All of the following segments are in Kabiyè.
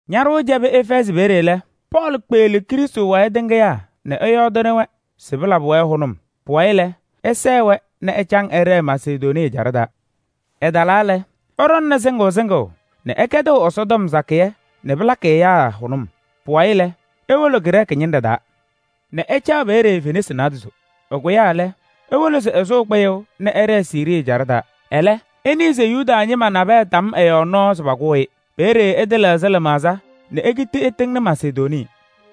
Ñaɖʋʋ cɛbɩ Efɛɛzɩ peeye lɛ, Pɔɔlɩ kpeɣli Krɩstʋ wayɩ tɩŋɩyaa nɛ ɛyɔɔdɩnɩ-wɛ se pɩlabɩ-wɛ hʋnʋm. Pʋwayɩ lɛ, ɛsɛɛ-wɛ nɛ ɛcaŋ ɛɖɛɛ Masedonii ɛjaɖɛ taa. Ɛtalaa lɛ, ɛɖɔŋnɩ sɩŋʋʋ sɩŋʋʋ nɛ ɛkɛdɩɣ Ɛsɔtɔm sakɩyɛ nɛ pɩlakɩ ɛyaa hʋnʋm. Pʋwayɩ lɛ, ewolo Grɛɛsɩ ñɩnɖɛ taa nɛ ɛcaɣ peeye fenasɩ naadozo. Ɛkʋyaa lɛ, ewolo se ɛsʋʋ kpɩyʋʋ nɛ ɛɖɛɛ Siirii ɛjaɖɛ taa. Ɛlɛ ɛnɩɩ se Yuda ñɩma nabɛyɛ tam ɛ-yɔɔ nɔɔ se pakʋʋ-ɩ. Peeye ɛtɩlɛɣzɩ lɩmaɣza nɛ ekiti ɛtɩŋnɩ Masedonii.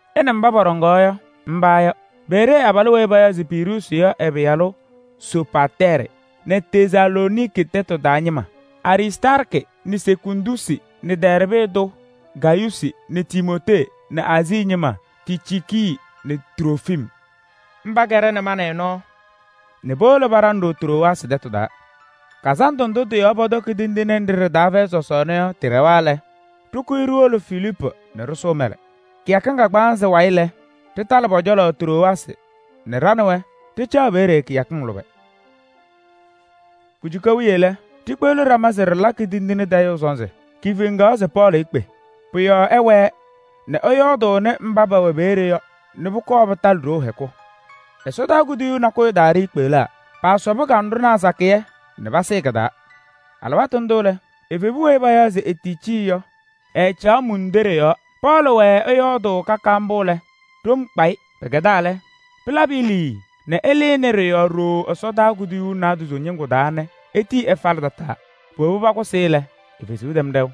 Ɛ nɛ mba pɔɖɔŋaɣ yɔ, mba yɔ: Beree abalʋ weyi payaɣ se Piruusi yɔ ɛ-pɩyalʋ Sopatɛɛrɩ nɛ Tesalooniki tɛtʋ taa ñɩma: Aristaarkɩ nɛ Sekundusi nɛ Dɛɛrbɩ tʋ Gayuusi nɛ Timootee nɛ Aazii ñɩma: Ticiiki nɛ Trofim. Mba kɛɖɛnɩ ma nɛ ɩ nɔɔ nɛ powolo paɖaŋ-ɖʋ Trowaasɩ tɛtʋ taa. Sɔsɔɔna Fɛyɩ Tindine Kazandʋ ɖɛwa lɛ, ɖɩkʋyɩ ɖiwolo Filiipu nɛ ɖɩsʋʋ mɛlɛ. Kɩyakɩŋ kagbaanzɩ wayɩ lɛ, ɖɩtalɩ pɔ-cɔlɔ Trowaasɩ nɛ ɖa nɛ wɛ ɖɩcaɣ peeye kɩyakɩŋ lʋbɛ. Kujuka wiye lɛ, ɖikpeɣli ɖama se ɖɩlakɩ tindine tayʋʋ sɔnzɩ. Kifeŋaɣ se Pɔɔlɩ ekpe. Pʋ-yɔɔ ɛɛwɛɛ nɛ ɛyɔɔdʋʋnɩ mba pɛwɛ peeye yɔ nɛ pʋkɔɔ pɩtalɩ ɖoo hɛkʋ. Ɛsɔdaa kuduyuu nakʋyʋ taa ɖiikpeɣlaa, paasɩ kanɖʋnaa sakɩyɛ kɩ-taa. Alɩwaatʋ ndʋ lɛ, evebu weyi payaɣ se Eticii yɔ, ɛɛcaɣ mundoɖe yɔɔ. Pɔɔlɩ wɛɛ ɛyɔɔdʋʋ ka ka mbʋ lɛ, ɖom kpaɣ-ɩ. Pɩkɛdaa lɛ, pɩlabɩ-ɩ liii nɛ ɛlɩnɩ ɖɩ-yɔɔ ɖooo ɛsɔdaa kuduyuu naadozo ñɩŋgʋ taa nɛ etii ɛfalɩ tataa. Powobi pakʋsɩ-ɩ lɛ, e-fezuu tɛm ɖɛʋ.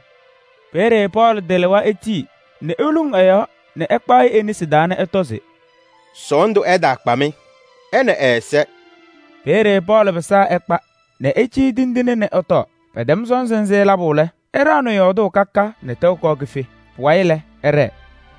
Peeye Pɔɔlɩ tɩlɩwa etii nɛ eluŋ ɛ-yɔɔ nɛ ɛkpaɣ-ɩ e-nesi taa nɛ ɛtɔ se: “Sɔɔndʋ ɛtaakpa-mɩ: ɛ nɛ ɛ-ɛza!” Ɛyɔɔdɩ mbʋ lɛ, evebu ɛnʋ efe nɛ pekpeni-i nɛ ɛ-alaafɩya tɩŋa. Ɛyaa na-ɩ mbʋ lɛ, patɩŋa pa-laŋa hɛɛ niɣ niɣ. Peeye Pɔɔlɩ pɩsaa ɛkpa nɛ ɛcɩyɩ tindine nɛ pala sɔnzɩ nzɩ. Pɛtɛma lɛ, ɛɖaɣnɩ yɔɔdʋʋ ka ka nɛ tɛʋ kɔɔ kife. Pʋwayɩ lɛ, ɛɖɛɛ.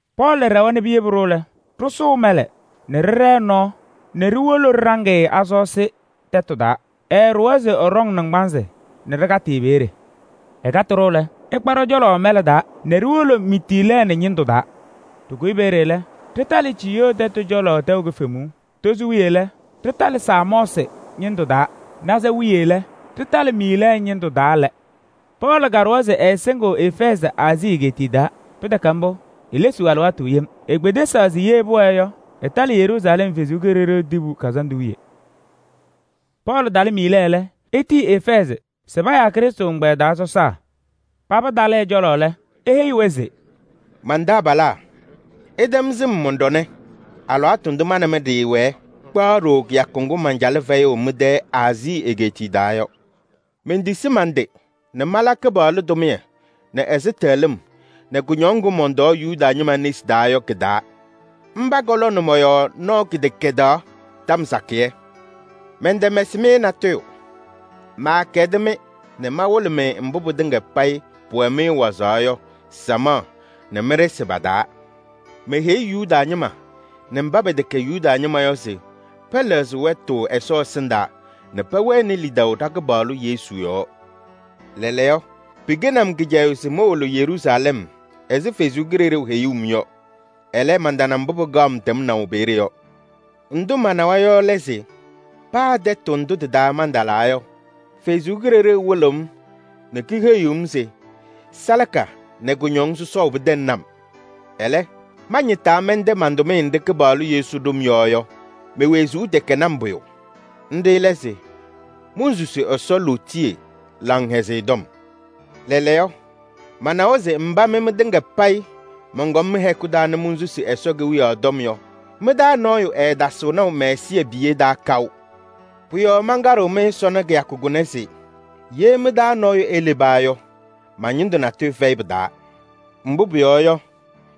Pɔɔlɩ ɖɛwa nɛ piyebi-ɖʋ lɛ, ɖɩsʋʋ mɛlɛ nɛ ɖɩɖɛɛ nɔɔ nɛ ɖiwolo ɖɩɖaŋ-ɩ Asoosi tɛtʋ taa. Ɛɛɖʋwa se ɛɖɔŋ naŋgbanzɩ nɛ ɖɩkatɩ-ɩ peeye. Ɛkatɩ-ɖʋ lɛ, ɛkpa ɖɔ-cɔlɔ mɛlɛ taa nɛ ɖiwolo Mitiilɛɛnɩ ñɩndʋ taa. Ɖɩkʋyɩ peeye lɛ, ɖɩtalɩ Ciyoo tɛtʋ cɔlɔ tɛʋ kifemuu. Tozo wiye lɛ, ɖɩtalɩ Samɔɔsɩ ñɩndʋ taa. Naza wiye lɛ, ɖɩtalɩ Miilɛɛ ñɩndʋ taa lɛ. Pɔɔlɩ kaɖʋwa se ɛɛsɩŋɩɣ Efɛɛzɩ Aazii egeetiye taa, pɩtɛkɛ mbʋ, elesiɣ alɩwaatʋ yem. Ekpedesaɣ se pʋwɛɛ yɔ, ɛtalɩ Yeruusalɛm Kʋmtʋ Kazandʋ wiye. Pɔɔlɩ talɩ Miilɛɛ lɛ, etiyi Efɛɛzɩ se payaa Krɩstʋ ɛgbɛyɛ taa sɔsaa. Paba talɩ ɛ-cɔlɔ lɛ, eheyi-wɛ se: “Man-taabalaa! Ɩtɛm sɩm mɔn-ɖɔnɛ alɩwaatʋ ndʋ ma nɛ mɩ ɖɩɩwɛɛ kpaɣ ɖooo kɩyakʋ ŋgʋ mancalɩ fɛyʋʋ mɩ-tɛ Aazii egeetiye taa yɔ. Mentisi man-tɩ nɛ mala Kɩpaɣlʋ tʋmɩyɛ nɛ ɛzɩtɛɣlɩm nɛ kʋñɔŋ ŋgʋ mɔntɔɔ Yuda ñɩma nesi taa yɔ kɩ-taa. Mba katamnɩ mɔ-yɔɔ nɔɔ tɔm sakɩyɛ. Mɛntɛmɛsɩ-mɩ natʋyʋ. Maakɛdɩ-mɩ nɛ mawɩlɩ-mɩ mbʋ pɩtɩŋa payɩ pʋwɛ-mɩ wazaɣ yɔ samaɣ nɛ mɩ-ɖɩsɩ pa-taa. Meheyi Yuda ñɩma nɛ mba pɛtɛkɛ Yuda ñɩma yɔ se pɛlɛɣzɩ wɛtʋ Ɛsɔ ɛsɩndaa nɛ pɛwɛnɩ lidaʋ ɖa-Kɩpaɣlʋ Yesu yɔɔ. Lɛɛlɛɛyɔ, pɩkɛnɩ-m kɩcɛyʋʋ se mowolo Yeruusalɛm ɛzɩ Ɛsɔ Kalɩzaɣ heyuu-m yɔ. Ɛlɛ, mantana mbʋ pɩkaɣ-m tɛmnaʋ peeye yɔ. Ndʋ manawa yɔ lɛ se: paa tɛtʋ ndʋ tɩ-taa mantalaa yɔ, Ɛsɔ Kalɩzaɣ wɩlɩɣ-m nɛ keheyiɣ-m se salaka nɛ kʋñɔŋ sɔsɔʋ pɩtɛŋnɩ-m. Ɛlɛ, mañɩtaa mɛntɛ man-tʋmɩyɛ nɖɩ Kɩpaɣlʋ Yesu ɖʋ-m yɔ yɔ, me-wezuu tɛkɛnɩ-m pʋyʋ. Nɖɩ lɛ se: monsusi Ɛsɔ lootiye Laŋhɛzɩyɛ Tɔm. Lɛɛlɛɛyɔ, manawa se mba mɩ mɩtɩŋa payɩ mɔnkɔm mɩ-hɛkʋ taa nɛ monsusi Ɛsɔ Kewiyaɣ tɔm yɔ, mɩ-taa nɔɔyʋ ɛɛtasɩɣ naʋ mɛ-ɛzɩbiye taa kaʋ. Pʋ-yɔɔ mankaɖɩɣ-mɩ sɔnɔ kɩyakʋ kʋnɛ se: ye mɩ-taa nɔɔyʋ eleba yɔ, ma-ñɩndʋ natʋyʋ fɛyɩ pɩ-taa. Mbʋ pʋyɔɔ yɔ,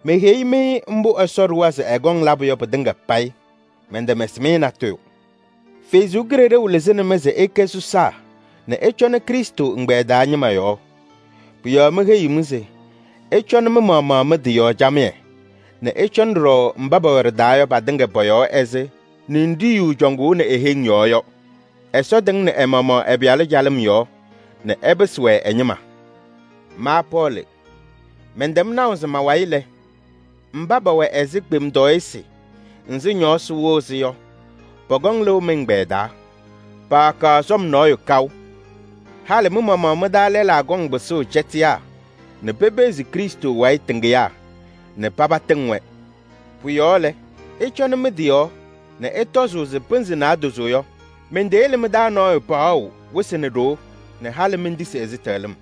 meheyi-mɩ mbʋ Ɛsɔ ɖʋwa se ɛkɔŋ labʋ yɔ pɩtɩŋa payɩ, mɛntɛmɛsɩ-mɩ natʋyʋ. Ɛsɔ Kalɩzaɣ lɩzɩnɩ-mɩ se ɩkɛ sɔsaa nɛ ɩcɔnɩ Krɩstʋ ɛgbɛyɛ taa ñɩma yɔɔ. Pʋ-yɔɔ meheyiɣ-mɩ se ɩcɔnɩ mɩ-maɣmaɣ mɩ-tɩ yɔɔ camɩyɛ nɛ ɩcɔnɩ ɖɔɖɔ mba pɛwɛ ɖɩ-taa yɔ patɩŋa pɔ-yɔɔ ɛzɩ ninɖiɣyu cɔŋʋʋnɩ e-heŋ yɔɔ yɔ. Ɛsɔ tɩŋnɩnɩ ɛ-maɣmaɣ ɛ-Pɩyalʋ calɩm yɔɔ nɛ ɛpɩsɩ-wɛ ɛ-ñɩma. Ma Pɔɔlɩ mɛntɛm naʋ se ma-wayɩ lɛ, mba pɛwɛ ɛzɩ kpemtɔɔyɩsɩ nzɩ ñɔɔsɩ wɩɣ-sɩ yɔ, pɔkɔŋ lɩʋ mɩ-ɛgbɛyɛ taa, paakaɣ sɔm nɔɔyʋ kaʋ. Halɩ mɩ-maɣmaɣ mɩ-taa lɛlaa kɔŋ pɩsʋʋ cɛtɩyaa nɛ pepeɣzi Krɩstʋ wayɩ tɩŋɩyaa nɛ paba tɩŋ-wɛ. Pʋ-yɔɔ lɛ, ɩcɔnɩ mɩ-tɩ yɔɔ nɛ ɩtɔzʋʋ se pɩnzɩ naadozo yɔ, menteyele mɩ-taa nɔɔyʋ paɣʋ wɩsɩ nɛ ɖoo nɛ halɩ mentisi ɛzɩtɛɣlɩm.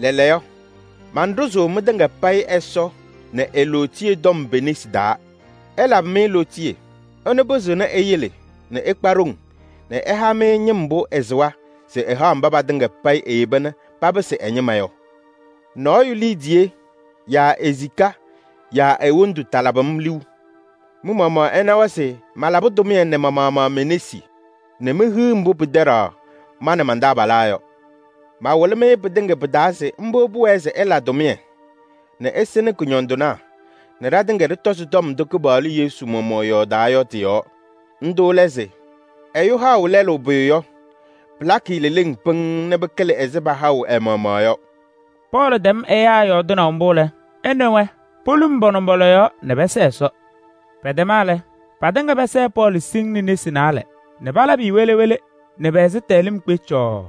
Lɛɛlɛɛyɔ, manɖʋzʋʋ mɩtɩŋa payɩ Ɛsɔ nɛ e-lootiye tɔm pe-nesi taa. Ɛlabɩ-mɩ lootiye. Ɛnʋ pɩzɩɣnɩ eyele nɛ ɩkpa ɖoŋ nɛ ɛha-mɩ ñɩm mbʋ ɛsɩwa se ɛhaɣ mba patɩŋa payɩ eyeba nɛ papɩsɩ ɛ-ñɩma yɔ. Nɔɔyʋ liidiye yaa e-sika yaa e-wondu talabɩ-m liu. Mɩ-maɣmaɣ ɩnawa se malabɩ tʋmɩyɛ nɛ ma-maɣmaɣ me-nesi nɛ mehiɣ mbʋ pɩtɛɖaɣ ma nɛ man-taabalaa yɔ. Mawɩlɩ-mɩ pɩtɩŋa pɩ-taa se mbʋ pʋwɛɛ se ɩla tʋmɩyɛ nɛ ɩsɩnɩ kʋñɔndɩnaa nɛ ɖatɩŋa ɖɩtɔzɩ tɔm ndʋ Kɩpaɣlʋ Yesu maɣmaɣ yɔɔdaa yɔ tɩ-yɔɔ. Ndʋ lɛ se: ‘Ɛyʋ haɣʋ lɛlʋ pʋyʋ yɔ, pɩlakɩ-ɩ leleŋ pɩŋŋ nɛ pɩkɩlɩ ɛzɩ pahaɣʋ ɛ-maɣmaɣ yɔ.’” Pɔɔlɩ tɛm ɛyaa yɔɔdɩnaʋ mbʋ lɛ, ɛ nɛ wɛ poluŋ pa-nʋmbɔla yɔɔ nɛ pɛsɛɛ Ɛsɔ. Pɛtɛma lɛ, patɩŋa pɛsɛɛ Pɔɔlɩ siŋŋ nesi naalɛ nɛ palabɩ-ɩ wele wele nɛ ɛzɩtɛɣlɩm cɔɔɔ.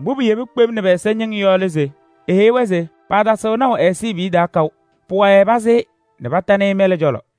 Mbʋ piyebi kpem nɛ pɛ-ɛza ñɩŋ yɔ lɛ se: eheyi-wɛ se paatasɩɣ naʋ ɛ-ɛzɩbiye taa kaʋ. Pʋwayɩ pasɩ-ɩ nɛ patanɩ-ɩ mɛlɛ cɔlɔ.